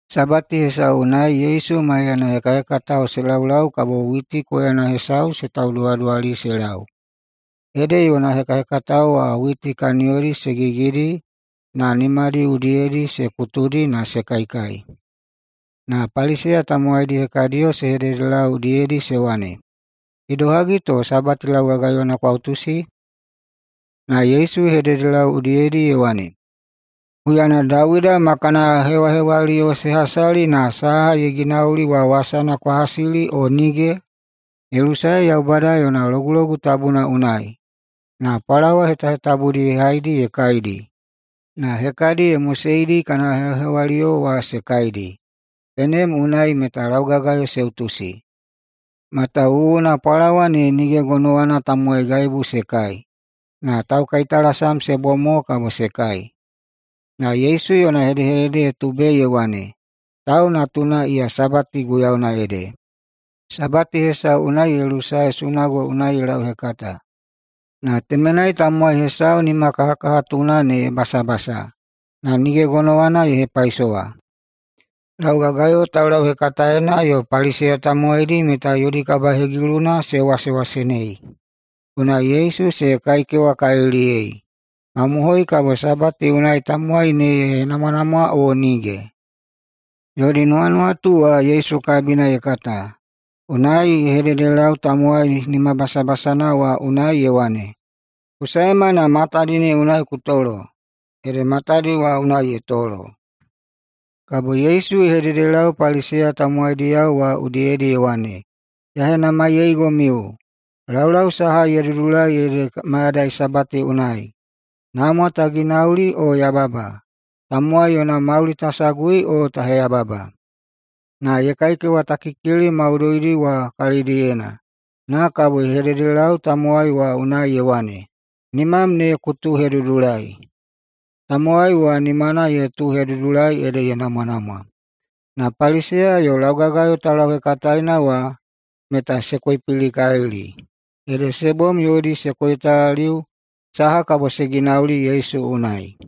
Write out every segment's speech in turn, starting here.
Sabati hesau unai Yesu maiyana hekahekatao se laulau kabo witi koyana hesau se tauduwaduwali se lau. Ede yona hekahekatao wa witi kaniyodi se gigidi na nimadi udiyedi se kutudi na se kaikai. Na Paliseya tamowaidi hekadiyo se hededelau udiyedi se wane, “Idohagi to Sabati laugagayona kwa utusi?” Na Yesu ye hededelau udiyedi ye wane, “Huyana Dawida ma kana hewahewaliyo se hasali na saha ye ginauli wa wasana kwa hasili o nige? Ye lusae Yaubada yona Logulogu Tabuna unai na pwalawa hetahetabudi ye haidi ye kaidi, na hekadi ye moseidi kana hewahewaliyo wa se kaidi. Tenem unai meta laugagayo se utusi, matawuwuna pwalawa ne nige gonowana tamowai gaibu se kai, na taukaitalasam se bom mo kabo se kai.” Na Yesu yona hedehedede ye tubei ye wane, “Tau Natuna iya Sabati guiyauna ede.” Sabati hesau unai ye lusae sunago unai ye lauhekata. Na temenai tamowai hesau nimakahakahatuna ne ye basabasa [na nige gonowana ye hepaisowa]. Laugagayo taulauhekataena yo Paliseya tamowaidi meta yodi kabahegiluna se wasewasenei, unai Yesu se kaikewakaliliyei, mamohoi kabo Sabati unai tamowai ne ye henamwanamwa o nige. Yodi nuwanuwatu wa Yesu kabina ye kata, unai ye hededelau tamowai nimabasabasana wa unai ye wane, “Ku saema na matadi ne unai ku tolo.” Ede matadi wa unai ye tolo. Kabo Yesu ye hededelau Paliseya tamowaidi wa udiyedi ye wane, “Ya henamaiyeigomiu: Laulau saha ye dudulai ede mayadai Sabati unai: namwa ta ginauli o yababa, tamowai yona mauli ta sagui o ta heyababa?” Na ye kaikewatakikili maudoidi wa kalidiyena na kabo ye hededelau tamowai wa unai ye wane, “Nimam ne ku tuuhedudulai!” Tamowai wa nimana ye tuuhedudulai ede ye namwanamwa. Na Paliseya yo laugagayo taulauhekataena wa meta se koipilikalili, ede se bom yodi se koitalaliu saha kabo se ginauli Yesu unai.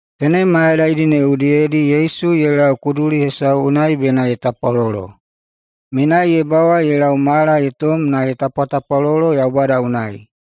Tenem mayadaidi ne udiyedi Yesu ye lau kuduli hesau unai bena ye tapwalolo. Menai ye bawa ye lau mala ye tom, na ye tapwatapwalolo Yaubada unai.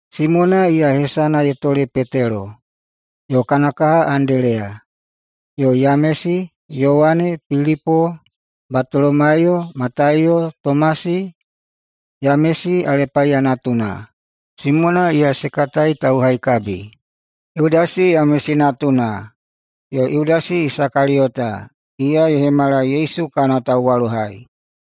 Simona, iya hesana ye tole Petelo, yo kana kaha Andeleya, yo Yamesi, Yowane, Pilipo, Batolomaiyo, Mataiyo, Tomasi, Yamesi Alepaiya natuna, Simona, iya se katai Tauhaikabi, Yudasi Yamesi natuna, yo Yudasi Isakaliyota, iya ye hemala Yesu kana tauwalohai.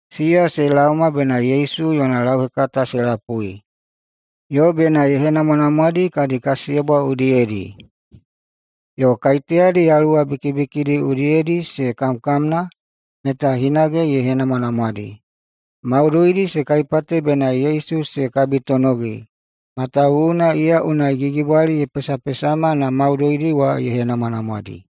Siya se laoma bena Yesu yona lauhekata se lapui, yo bena ye henamwanamwadi kadi kasiyebwa udiyedi. Yo kaiteyadi yaluwa bikibikidi udiyedi se kamkamna, meta hinage ye henamwanamwadi. Maudoidi se kaipate bena Yesu se kabitonogi, matawuwuna iya unai gigibwali ye pesapesama na maudoidi wa ye henamwanamwadi.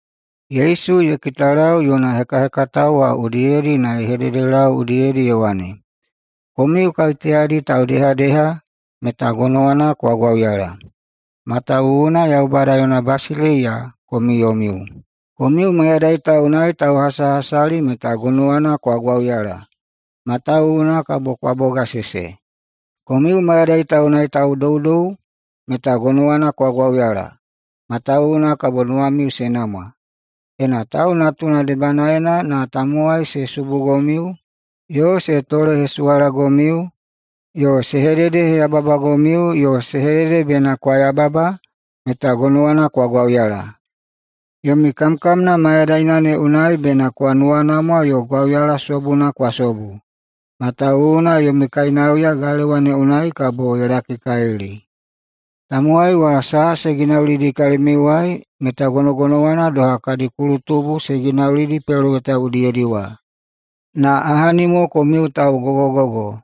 Yesu ye kitalau yona hekahekatao udiyedi na ye hededelau udiyedi ye wane, “Komiu kaiteyadi taudehadeha meta gonowana kwa gwauyala, matawuwuna Yaubada yona basileiya komiu yomiu. Komiu mayadai ta unai tauhasahasali, meta gonowana kwa gwauyala, matawuwuna kabo kwa bogasese. Komiu mayadai ta unai taudoudou, meta gonowana kwa gwauyala, matawuwuna kabo nuwamiu se namwa. Ena Tau Natuna debanaena na tamowai se subugomiu yo se tolehesuwalagomiu yo se hededeheyababagomiu yo se hedede bena kwa yababa, meta gonowana kwa gwauyala. Yomi kamkamna mayadaina ne unai bena kwa nuwanamwa yo gwauyala sobuna kwa sobu, matawuwuna yomi kainauya galewa ne unai kabo ye lakikalili. Tamowai wa saha se ginaulidi kalimiuwai meta gonogonowana doha kadi kulutubu se ginaulidi peloweta udiyedi wa. Na ahani mo komiu taugogogogo,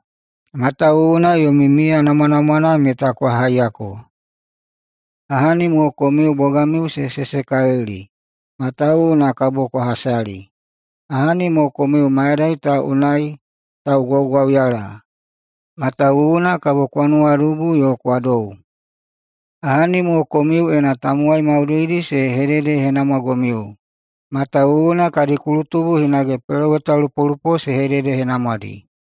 matawuwuna yomi miya namwanamwana meta kwa haiyako. Ahani mo komiu bogamiu se sesekalili, matawuwuna kabo kwa hasali. Ahani mo komiu mayadai ta unai taugwaugwauyala, matawuwuna kabo kwa nuwadubu yo kwa dou. Ahani mo komiu, ena tamowai maudoidi se hededehenamwagomiu, matawuwuna kadi kulutubu hinage pelowetalupolupo se hededehenamwadi.”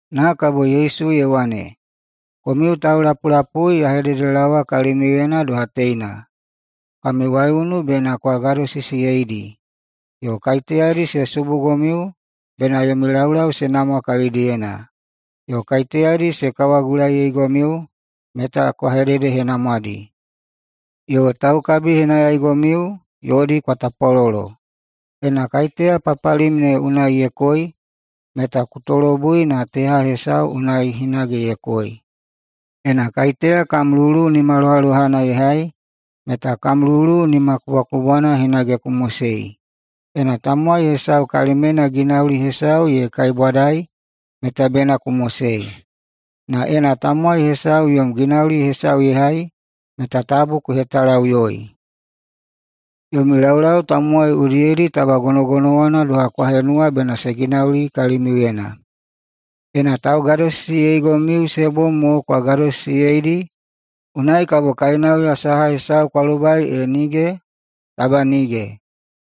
Na kabo Yesu ye wane, “Komiu taulapulapui, ya hededelaowa kalimiuyena doha teina: Kami waiunu bena kwa gadosisiyeidi, yo kaiteyadi se subugomiu bena yomi laulau se namwa kalidiyena, yo kaiteyadi se kawagulaiyeigomiu meta kwa hededehenamwadi, yo taukabihenayaigomiu yodi kwa tapwalolo. Ena kaiteya papalim ne unai ye koi, meta ku tolobui na teha hesau ne unai hinage ye koi. Ena kaiteya kam lulu nimalohalohana ye hai, meta kam lulu nimakubwakubwana hinage ku mosei. Ena tamowai hesau kalimyena ginauli hesau ye kaibwadai, meta bena ku mosei, na ena tamowai hesau yom ginauli hesau ye hai, meta tabu ku hetalaꞌuyoi. Yomi laulau tamowai udiyedi taba gonogonowana doha kwa henuwa bena se ginauli kalimiuyena. Ena taugadosisiyeigomiu se bom mo kwa gadosisiyeidi, unai kabo kainauya saha hesau kwa lobai, e nige? Taba nige,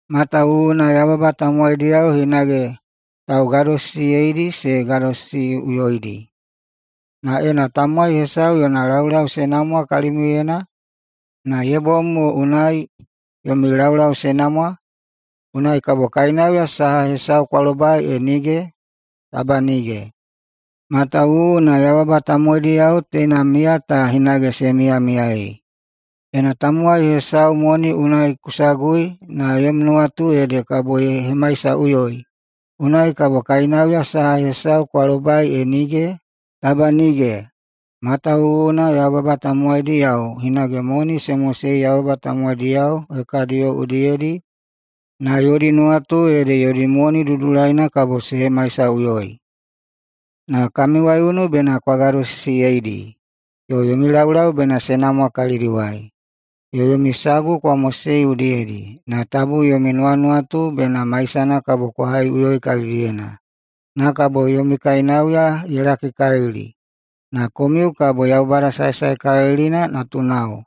matawuwuna yababa tamowaidiyao hinage taugadosisiyeidi se gadosisiꞌuyoidi. Na ena tamowai hesau yona laulau se namwa kalimiuyena, na ye bom mo unai yomi laulau se namwa, unai kabo kainauya saha hesau kwa lobai, e nige? Taba nige, matawuwuna yababa tamowaidiyao teina miya ta hinage se miyamiyaei. Ena tamowai hesau moni unai ku sagui na yom nuwatu ede kabo ye hemaisaꞌuyoi, unai kabo kainauya saha hesau kwa lobai, e nige? Taba nige, matawuwuna yababa tamowaidiyao hinage moni se mosei yababa tamowaidiyao hekadiyo udiyedi na yodi nuwatu ede yodi moni ne dudulaina kabo se hemaisaꞌuyoi. Na kami waiunu bena kwa gadosisiyeidi, yo yomi laulau bena se namwa kalidiwai, yo yomi sagu kwa mosei udiyedi, na tabu yomi nuwanuwatu bena maisana kwa haiꞌuyoi kalidiyena. Na kabo yomi kainauya ye lakikalili, na komiu kabo Yaubada Saesaekalilina natunao,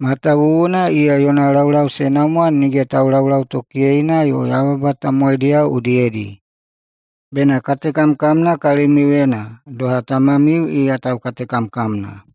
matawuwuna iya yona laulau se namwa nige taulaulautokiyeina yo yababa tamowaidi udiyedi. Bena katekamkamna kalimiuyena, doha Tamamiu iya taukatekamkamna.”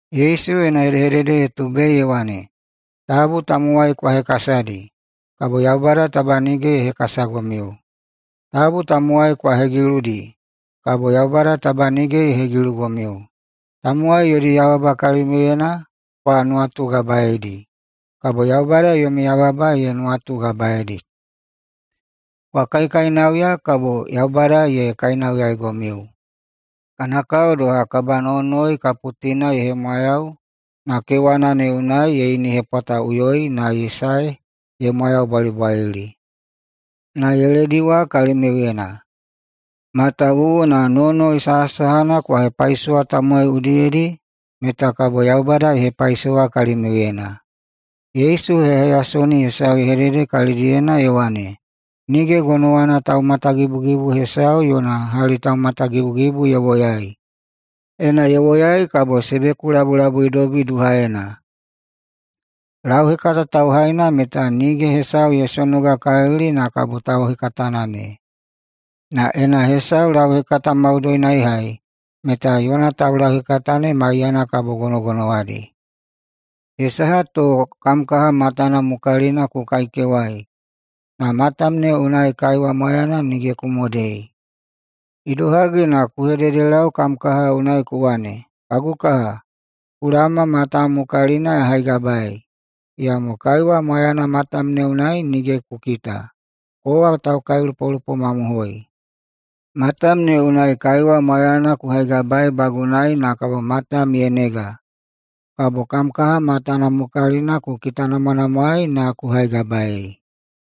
[Yesu yona hedehedede ye tubei ye wane,] “Tabu tamowai kwa hekasadi, kabo Yaubada taba nige ye hekasagomiu. Tabu tamowai kwa hegiludi, kabo Yaubada taba nige ye hegilugomiu. Tamowai yodi yababa kalimiuyena kwa nuwatugabaedi, kabo Yaubada yomi yababa ye nuwatugabaedi. Kwa kaikainauya, kabo Yaubada ye kainauyaigomiu. Kana kao doha kabanowonowoi kaputina ye hemwayau na kewana ne unai ye inihepwataꞌuyoi na ye sae ye mwayaubwalibwalili na ye lediwa kalimiuyena. Matawuwuna nowonowoi sahasahana kwa hepaisowa tamowai udiyedi meta Yaubada kabo ye hepaisowa kalimiuyena.” Yesu heyaheyasoni hesau ye hedede kalidiyena, ye wane, “Nige gonowana taumatagibugibu hesau yona hali taumatagibugibu ye woyai. Ena ye woyai, kabo se bekulabulabuidobi duhaena. Lauhekata tauhaina meta nige hesau ye sonogakalili na kabo tauhekatana ne. Na ena hesau lauhekata maudoina ye hai, meta yona taulauhekata ne maiyana kabo gonogonowadi. Ye saha to kam kaha matana mukalina ku kaikewai, na matam ne unai kaiwa mwayana nige ku modei? Idohagi na ku hededelau kam kaha unai ku wane, ‘Kagu kaha, ku laoma matam mukalina ya haigabaei,’ iyamo kaiwa mwayana matam ne unai nige ku kita? Kowa taukailupolupo mamohoi! Matam ne unai kaiwa mwayana ku haigabaeibagunai na matam ne ye nega, kabo kam kaha matana mukalina ku kitanamwanamwaei na ku haigabaei!”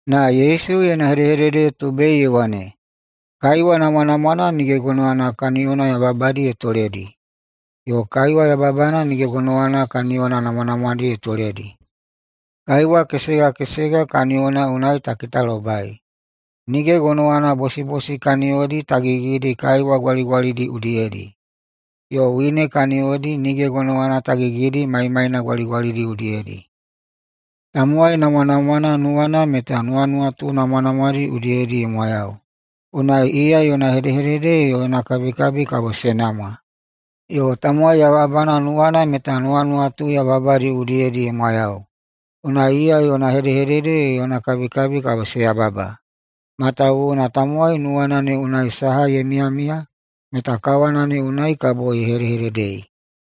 [Na Yesu yona hedehedede ye tubei ye wane,] “Kaiwa namwanamwana nige gonowana kaniyona yababadi ye toledi, yo kaiwa yababana nige gonowana kaniyona namwanamwadi ye toledi. Kaiwa kesega kesega kaniyona unai ta kitalobai. Nige gonowana bosibosi kaniyodi ta gigidi kaiwa gwaligwalidi udiyedi, yo wine kaniyodi nige gonowana ta gigidi maimaina gwaligwalidi udiyedi. Tamowai namwanamwana nuwana meta nuwanuwatu namwanamwadi udiyedi ye mwayau, unai iya yona hedehedede yo yona kabikabi kabo se namwa. Yo tamowai yababana nuwana meta nuwanuwatu yababadi udiyedi ye mwayau, unai iya yona hedehedede yo yona kabikabi kabo se yababa. Matawuwuna tamowai nuwana ne unai saha ye miyamiya, meta kawana ne unai kabo ye hedehededei.”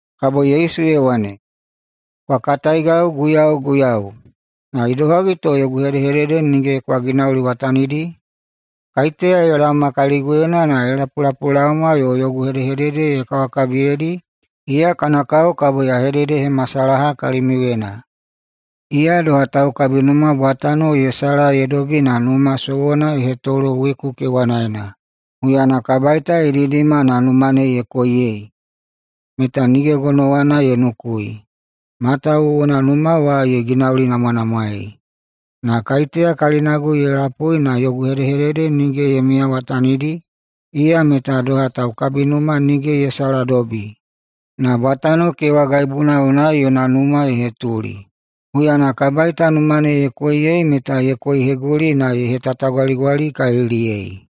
[Kabo Yesu ye wane,] “Kwa kataigau ‘Guiyau, Guiyau!’, na idohagi to yogu hedehedede nige kwa ginauliwatanidi? Kaiteya ye laoma kaliguyena na ye lapulapulaoma yo yogu hedehedede ye kawakabiyedi, iya kana kao kabo ya hededehemasalaha kalimiuyena: Iya doha taukabinuma bwatano ye sala ye dobi na numa sowona ye hetolo weku kewanaena. Huyana kabaita ye didima na numa ne ye koiyei, meta nige gonowana ye nukui, matawuwuna numa wa ye ginaulinamwanamwaei. Na kaiteya kalinagu ye lapui na yogu hedehedede nige ye miyawatanidi, iya meta doha taukabinuma nige ye saladobi, na bwatano kewagaibuna unai yona numa ye hetuli. Huyana kabaita numa ne ye koiyei meta ye koiheguli na ye hetatagwaligwalikaliliyei.”